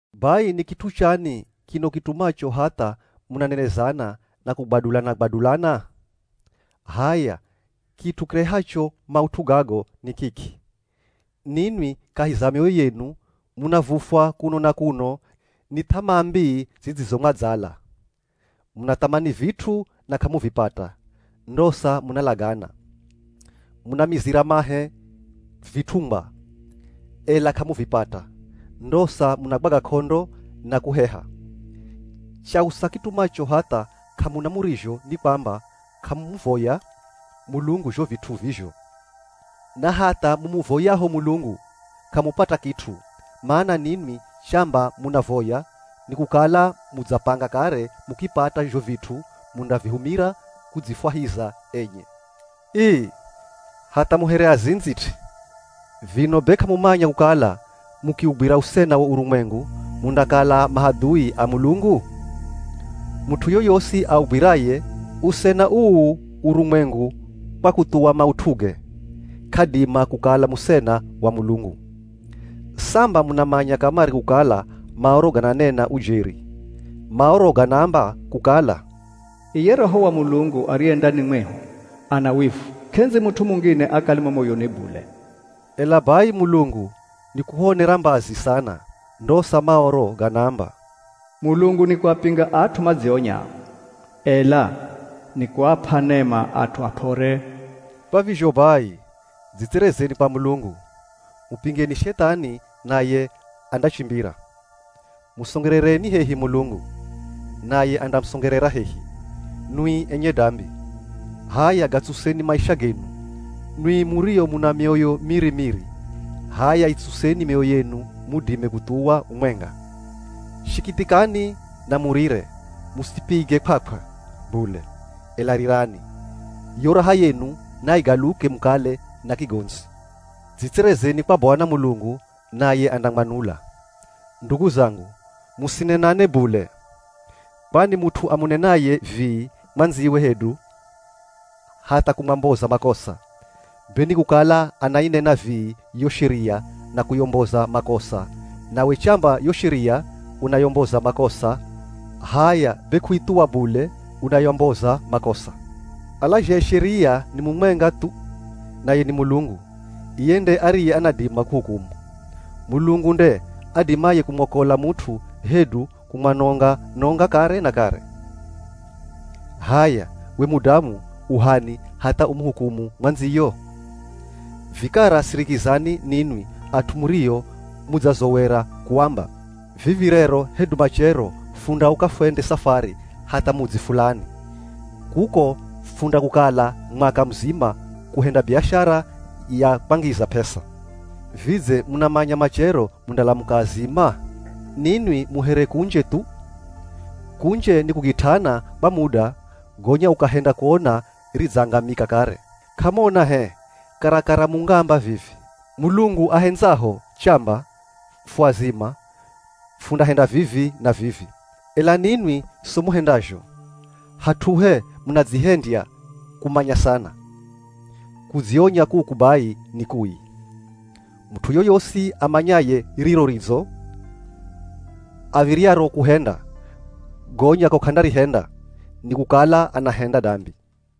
Bai ni kit'u chani kino kitumacho hatha munanenezana na kugwadulana-gwadulana? H'aya, kit'u kirehacho maut'u gago ni kiki: Ninwi kahi za mioyo yenu munavufwa kuno na kuno ni th'amaa mbii zidzizomwadzala. Munathamani vit'u na k'amuvipata, ndosa munalagana. Munamizira mahe vit'ungwa, ela k'amuvipata, ndosa munagwaga k'ondo na kuheha. Chausa kitumacho hatha k'amuna murizho ni kwamba k'amumuvoya Mulungu zho vit'u vizho. Na hatha mumuvoyaho Mulungu, k'amupata kit'u, mana ninwi chamba munavoya nikukala mudzapanga kare mukipata zho vit'u mundavihumira kudzifwahiza enye. Ii, hatha mu here azindzi t'i. Vino be k'amumanya kukala mukiugwira usena wo urumwengu mundakala mahadhui a Mulungu? Mut'u yoyosi augwiraye usena uu urumwengu kwa kuthuwa maut'uge, k'adima kukala musena wa Mulungu. Samba munamanya kamare kukala Maoro gananena ujeri. Maoro ganaamba kukala, “Iye Roho wa Mulungu ariye ndani mwehu ana wivu, k'endzi mut'u mungine akale mo moyoni bule.” Ela bai Mulungu nikuhuonera mbazi sana, ndosa Maoro ganaamba, “Mulungu nikuapinga at'u madzionyao, ela nikuap'a nema at'u ap'ore.” Kwa vizho bai, dzitserezeni kwa Mulungu. Mupingeni Shethani naye andachimbira. Musongerereni hehi Mulungu, naye andamusongerera hehi. Nwi enye dambi, h'aya gatsuseni maisha genu. Nwi murio muna mioyo miri-miri, h'aya itsuseni mioyo yenu mudime kuthuwa umwenga. Shikithikani, na murire. Musipige kw'akw'a bule, ela rirani. Yo raha yenu naigaluke mukale na kigondzi! Dzitserezeni kwa Bwana Mulungu naye andamwanula. Ndugu zangu, musinenane bule. Kwani mut'u amunenaye vii mwandziwe hedu hatha kumwamboza makosa, be nikukala anainena vii yo sheria na kuyomboza makosa. Nawe chamba yo sheria unayomboza makosa, h'aya be kuithuwa bule, unayomboza makosa. Alazhaye sheria ni mumwenga thu, naye ni Mulungu. Iye nde ariye anadima kuhukumu. Mulungu nde adimaye kumwakola mut'u hedu kumwanonga-nonga kare na kare. H'aya, we mudamu u h'ani hatha umuhukumu mwandziyo? Vikara sirikizani ninwi at'u murio mudzazowera kuamba, “Vivi rero hedu machero fundauka fwende safari hatha mudzi fulani. Kuko, fundakukala mwaka muzima kuhenda biashara ya kwangiza p'esa.” Vidze munamanya machero mundalamuka azima? Ninwi mu here kunje thu. Kunje ni kugit'ana kwa muda, gonya ukahenda kuona ridzangamika kare. K'amuona h'e, karakara mungaamba vivi, “Mulungu ahendzaho, chamba fu azima, fundahenda vivi na vivi.” Ela ninwi, so muhendazho, hat'uhe munadzihendya kumanya sana. Kudzionya kuku bai ni kui. Mut'u yoyosi amanyaye riro ridzo av̱iryaro kuhenda, gonya ko k'andarihenda, nikukala anahenda dambi.